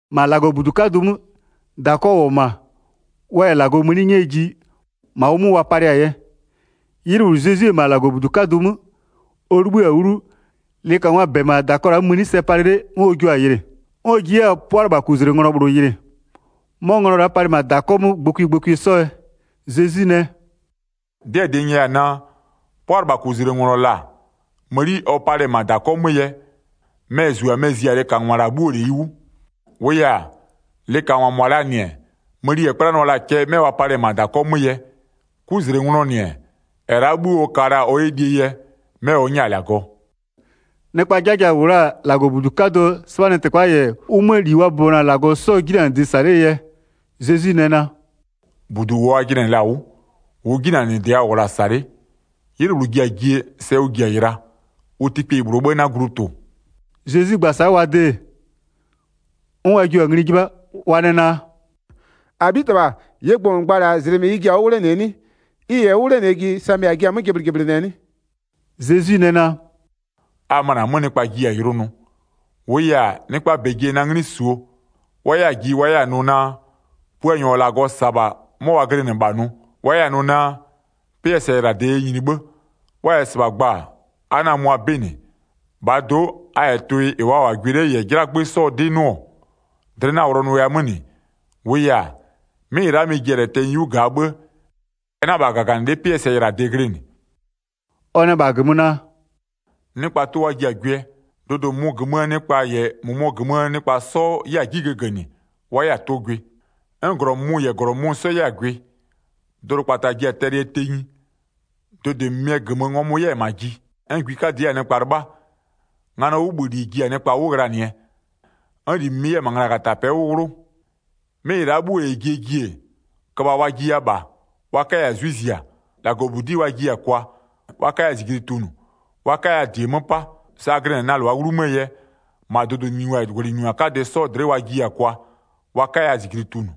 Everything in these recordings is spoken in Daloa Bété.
1-Ma -Lagɔbudu 'kadʋ 'mö, -dakɔ -wʋ-ɔ -ma, wa -yɛ -Lagɔ mëni 'nyɛɛ ji, -ma ʋ 'mö wa palɩɛ-a yɛ. 'Ylɩ -bhlʋ Zezwi-e -ma -Lagɔbudu 'kadʋ 'mö, ɔ 'libhï-a 'wlu, lɩkangwaa -bɛ-ɛ -ma -dakɔ la'aa 'mö mëni sɛ palɩ 'le 'n ɔ jua-a yɩlɩ. 'N ɔ ji 'yɛ-a 'pʋalɩbhakuzlenglɔ -bhlʋ yɩlɩ. 'Mɔ nglɔ la'a palɩ -ma -dakɔ 'mö gbɔkwie gbɔkwie 'sɔ yɛ. Zezwi nɛ: “'Dɩɛ -dɩ n nyɛya-a naa, 'pʋalɩbhakuzlenglɔ -la mëni ɔ palɩ-ɛ -ma -dakɔ 'mö yɛ, mɛ-ɛ -zu-a mɛ-ɛ zi-a lɩkangwa -la 'bhuoo -leyi 'wʋ. 4-Wʋʋ yɛ-a, lɩkangwa -mʋa -laa -nɩ-ɛ, mëni -ɛ 'kplanʋa la-a cɛ 'mɛ wa palɩ-ɛ -ma -dakɔ 'mö yɛ, 'kuzlenglɔɔ -nɩ-ɛ, -ɛ la'a 'bhuo ɔ ka la-a ɔ 'yɛ lie yɛ, 'mɛ ɔ 'nyɛ-a -Lagɔ.” Nɩkpaa 'jaja-a -wʋ la-a -Lagɔbudu 'kadʋɔ 'sɩbhanɩtɩkpa -yɛ ʋ 'möö -li wa bʋbɔnʋ-a -Lagɔ 'sɔɔ 'jinanɩdɩ -sa 'lee yɛ, Zezwi nɛ naa: “-Budu -ʋ a jɩnɩ-ɛ -la 'wʋ, -ʋʋ 'jinanɩdɩ a -wʋ-ɔ -la -sa 'le, 'ylɩ -bhlʋ ji-a jie, sɛ ʋ ji-a yɩla, ʋ tɩkpeyi -bhlʋɔ 'bhë 'na glu tʋ-ʋ.” Zezwi gba-a sa'a wa de-e, 'n wa jio-a ngli 'jɩbha, wa nɛ naa: “-Abhitɩbha, -ɩɩ gbʋ -n gba-a -la, -zlɩmɩ ɩ ji-a 'wʋ 'wlenɩɛ 'nɩ? Ɩ -yɛ 'wʋ 'wlenɩɛ ji sa -a jiɩ-a 'mö jɩblɩjɩblɩnɩɛ 'nɩ?” Zezwi nɛ naa: “A möna 'mö nɩkpa jiya-a yʋlʋ nʋ, -wʋʋ yɛ-a, nɩkpaa -bɛ ji-a na 'nglɩ -suo, wa 'yɛ-a ji wa 'yɛ-a nʋ naa, Puanyɔ -ɔ -Lagɔ -sa-a -bha 'mɔ wa glɩnɩ -bha nʋ, wa 'yɛ-a nʋ naa: 'Pɩɛ sɛyɩlade yɛ nyini 'bhë. Wa -yɛ -sɩbha gba-a, a 'na-a mʋa 'bɩ -nɩ. 9-Bhaa do'o, a -yɛ tʋɩ -ɩ wa -wʋ-a gwɩ 'le -yɛ 'jlagbö 'sɔɔ 'dɩ 'nʋ-ɔ, dlɩ 'na-a wʋlɔnʋya 'mö -nɩ, -wʋʋ yɛ-a, 'mɩ -ɩ la'a mɩ-ɩ ji-a tɛnyɩ 'yu -gaa 'bhë-ë, ɛ 'na -bha -gaganɩlɩ'ɩ 'pɩɛ sɛyɩlade glɩnɩ.” Ɔ nɛ -bha -gömö naa: “Nɩkpa, tʋ wa ji-a gwɩɛ, dʋdʋ -mʋmʋɔ -gömöö nɩkpa -yɛ -mʋmʋɔ -gömöö nɩkpa 'sɔ 'yɛ-a 'ji gëgënɩ wa 'yɛ-a tʋ gwɩ. 'N -glɔ -mʋmʋ -yɛ -glɔ -mʋmʋ 'sɔ 'yɛ 'yɛ-a gwɩ. Dʋdʋkpata ji-a tɛlɩɛ tenyi, dʋdʋɩ -mɩmɩɛ -gömö, ngɔmʋ 'yɛ-ɛ -ma ji, 'n gwi 'kadɩ 'yɛ-a nɩkpa 'lɩbha, nganɔɔ 'wʋbhïli ji-a nɩkpa 'wʋ ghlanɩɛ, 'n -li -mɩmɩ 'yɛ-a -ma nglagatapɛ'ɛ 'wʋ 'wlʋ. 'Mɩ -ɩ la'a 'bhuo 'yɛ jie ji-e, köbha wa jiya -bha, wa 'kaya-a 'zwɩ zia. -Lagɔbudi'i wa jiya-a kwa, wa 'kaya -zijli tunʋ, wa 'kaya -die 'mö 'pa. Sa a glɩnɩ-a na -lʋaa 'wlumöö yɛ, -ma dʋdʋnyiningwa -yɛ -gwlɩnyiningwa 'kadɩ 'sɔɔ dlɩ'ɩ wa jiya-a kwa, wa 'kaya -zijli tunʋ.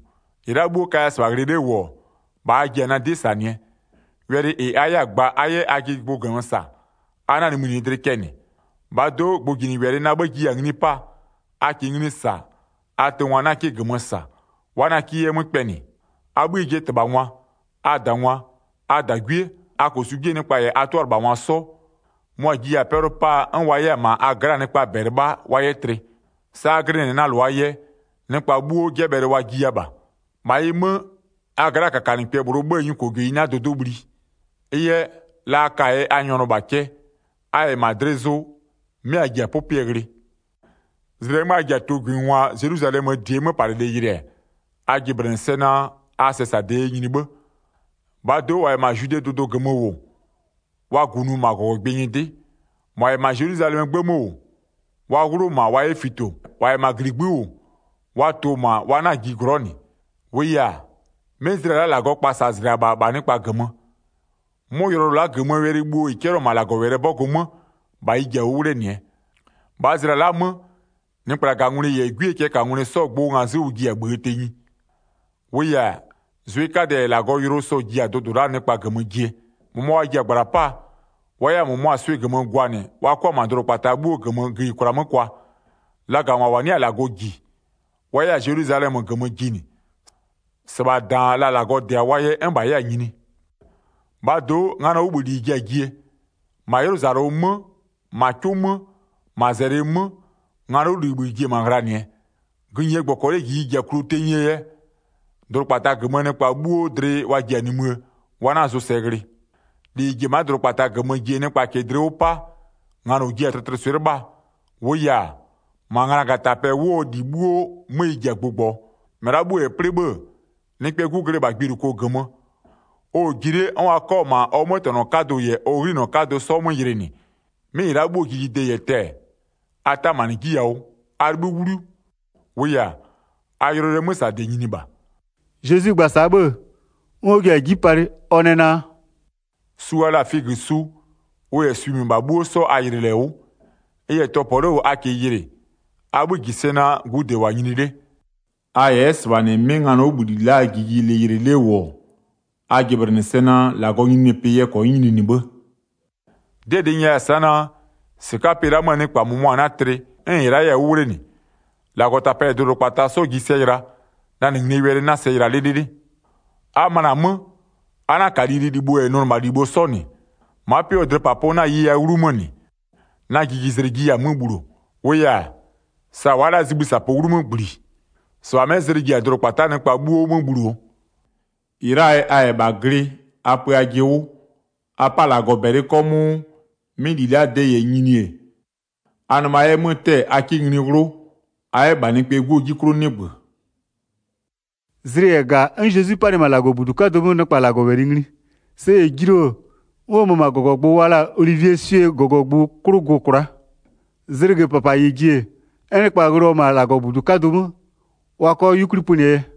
13-Ɩ la'a 'bhuo kaya -sɩbha ghlɩ 'le -wʋ-ɔ, -bha a ji-a na 'dɩ -sanɩɛ. Wɛlɩ -ɩ a 'yɛ-a gba a 'yɛ ajɩ gbʋ -gömö -sa, a 'na-a nimïnɩɩ dlɩ cɛ -nɩ. 15-Bhaa do'o gbʋjinɩwɛlɩ na 'bhë jiya-a ngli 'paa, a -kɩɩ ngli -sa, a tʋngwa 'na 'kɩ -gömö -sa, wa 'na 'kɩ 'yɛ 'mö kpɛnɩ. A 'bhïë jɩɛ -tɩbhangwa, a -dangwa, a -dagwie, a -kosu 'jie nɩkpa -yɛ a 'tʋalɩbhangwa 'sɔ, mʋa-a jiya-a 'pɛlʋ 'paa 'n wa 'yɛ-a -ma a gla'aa nɩkpaa -bɛ 'lɩbha wa 'yɛ tlɩ. Sa a glɩnɩ-ɛ na -lʋaa yɛ, nɩkpa 'bhuo 'jɛbhɛlɩɛ wa jiya -bha. 18-Ma ɩ 'mö, a gla'aa -kakanɩkpɛ -bhlʋɔ 'bhëë nyukojeyi 'na dʋdʋ'ʋ bhli. Ɩ yɛ, la a ka-a yɛ a nyɔnʋ -bha cɛ, a -yɛ -ma dlɩ zʋ, 'mɩ a ji-a 'pʋpʋɛ ghlɩɛ. Zlɩ -ɛɛ 'mö a ji-a tʋgwɩngwa Zelwizalɛmöö -die 'möpalɩlɩ yɩlɩ-ɛ, a jɩblɩnɩ sɛ naa, a sɛsade yɛ nyini 'bhë. 21-Bhaa do'o, -wa -yɛ -ma Zwidee dʋdʋ -gömö -wʋ, wa -gunʋ -ma -gɔgɔgbɩ nyɩdɩ, -mʋa -yɛ -ma Zelwizalɛmöö 'gbë 'mö -wʋ, wa 'wlʋ -ma wa 'yɛ fito, -wa -yɛ -ma -gligbï'ï -wʋ, wa tʋ-ʋ -ma wa 'na-a ji glɔ'ɔ -nɩ. 22-Wʋʋ yɛ-a, 'mɩ zlɩa la'a -Lagɔɔ kpasazlɩa -bha -bha nɩkpa -gömö. 'Mʋ yʋlɔyʋlʋ la'a -gömöö wɛlɩ bhuo -ɩ 'cɛlɩɔ-ɔ -ma -Lagɔwɛlɩɛ 'bɔgʋ 'mö, -bha ɩ ji-a 'wʋ 'wlenɩɛ. 23-Bhaa zlɩa la'a 'mö, nɩkplagangwlɩ -yɛ 'gwiee cɛɛkangwlɩ 'sɔɔ gbʋ ngazɩ'ɩ ʋ ji-a -bhïë tenyi. -Wʋʋ yɛ-a, zwɩ 'kadɛ -yɛ -Lagɔɔ yʋlʋ sɔ-ɔ ji-a dʋdʋ la'aa nɩkpa -gömö jie. 24-Mʋmʋa wa ji-a -gbla 'paa, wa 'yɛ-a -mʋmʋa swɩ -gömö gwanɩ wa 'kʋa-a -ma dʋdʋkpataa 'bhuo -gömö gïyikwla 'mö kwa. Lagangwa -wa 'nɩ-a -Lagɔ -ji, wa 'yɛ-a Zelwizalɛmö -gömö jinɩ, -sɩbha -daan la -Lagɔ -dɩ-a wa yɛ 'n -bha 'yɛ-a nyini. Zezwi yɛ ɔ nimïjigbʋ gba 25-Bhaa do'o, nganɔɔ 'wʋbhïli ji-a jie. -Ma 'ylʋzalʋ 'mö, -ma 'cʋ 'mö, -ma -zɛlɩ 'mö, nganɔɔ 'wʋbhïli ji-e -ma ghlanɩɛ. Gïnyie -gbɔkɔlɩɛ -jiji ji-a kluo tenyie yɛ, dʋdʋkpata -gömöö nɩkpa 'bhuo dlɩ wa ji-a nimïë wa 'na zʋsɛ ghlɩ. 26-Li -ɩ ji-e ma'a dʋdʋkpata -gömö jie nɩkpa -kɩɩ dlɩ 'wʋ 'pa, nganɔ jua-a tlɩtlɩswɩ'ɩ 'lɩbhaa. -Wʋʋ yɛ-a, -ma nglagatapɛ 'wʋɔ -li 'bhuo 'mö ɩ ji-a gbʋgbɔɔ. 27-Mɩ la'a 'bhuo -yɛ plɩ 'bhë-ë, Nɩkpɛɛ 'Gu glɩ -bha gbiluko -gömö, ɔ-ɔ ji 'le 'n wa 'kɔ-a -ma ɔ 'mötɛnɔ 'kadʋ -yɛ ɔ 'ghlinɔ 'kadʋ 'sɔ 'mö yɩlɩnɩ. 28'Mɩ -ɩ la'a 'bhuoo jijie -yɛ tɛ-ɛ, a 'tamanɩ 'ji yawʋ, a 'libhï 'wlu, -wʋʋ yɛ-a, a yʋlɔyʋlʋɛ 'mösade nyini -bha.” 29Zezwi gba-a sa'a 'bhë-ë, 'n ɔ ji-a 'ji palɩ, ɔ nɛ naa: “Su wa la-a figösu, ʋ -yɛ swi -mɩbha 'bhuo 'sɔ a yɩlɩɩ -lɛ 'wʋ. 30Ɩ -yɛ tɔpɔ 'le -wʋ a -kɩɩ yɩlɩ, a 'bhï -ji sɛ naa, gude -wʋ-a nyini 'le. 31A -yɛ 'yɛ -sɩbha -nɩ 'mɩ nganɔɔ 'wʋbhïli la'aa jijilɩ yɩlɩ 'le -wʋ-ɔ, a jɩblɩnɩ sɛ naa, -Lagɔɔ nyininyinipɩ yɛ -kɔnyɩ nyininɩ 'bhë. 32'Dɩɛ -dɩ n nyɛya-a sa'a naa: -Sɩka'aa pɩ la'a 'möö nɩkpa -mʋmʋa 'na tlɩ 'n -ɩ la'a 'yɛ-a 'wʋ 'wlenɩ. 33-Lagɔtapɛ -yɛ dʋdʋkpata 'sɔ ji sɛ yɩla, na -nɩ nglie wɛlɩ 'na sɛ yɩla 'lɩlɩlɩ. Zezwi nɛ naa: A pö ajɩ 'wʋ a 'yɛ -bha glɩ 34A möna 'mö, a 'na-a -ka lililibho -yɛ nʋnɩmalibho 'sɔ -nɩ. Ma'a 'pɩ 'wʋɔ dlɩpapʋ 'na-a yeya 'wlu 'mö -nɩ, na jijizlɩ jiya-a 'mö bhuluo. 35-Wʋʋ yɛ-a, sa wa'a la'a zibhï -sapʋ 'wlu 'mö -gbli, -sɩbha 'mɛ zlɩ ji-a dʋdʋkpata -gömöö nɩkpa 'bhuo 'mö bhuluo. 36-Ɩ la'aa yɛ, a -yɛ -bha glɩ a pö ajɩ 'wʋ. A 'pa -Lagɔ -bɛlɩ 'kɔmʋʋ 'mɩ -li la'aa de -yɛ nyini-e, a nɩma 'yɛ 'mö 'tɛ-ɛ a 'kɩ ngli 'wlʋ, a 'yɛ -bha Nɩkpɛɛ 'Guo 'ji 'klʋ 'nɩgbö.” 37Zlɩ -yɛ -ga 'n Zezwi 'panɩ-ɛ -ma -Lagɔbudu 'kadʋ 'mö nɩkpa -Lagɔwɛlɩ ngli. Sɛ -yɛ julu-o, 'n ɔ mö-ö -ma -gɔgɔgbʋ wa la-a Olivieswie -gɔgɔgbʋ 'klʋ gʋ-ʋ kwla'a. 38Zlɩgö -papa -yɛ ji-e, 'n nɩkpa ghlɩɔ-ɔ -ma -Lagɔbudu 'kadʋ 'mö, wa 'kɔ 'yukwli pönɩɛ yɛ.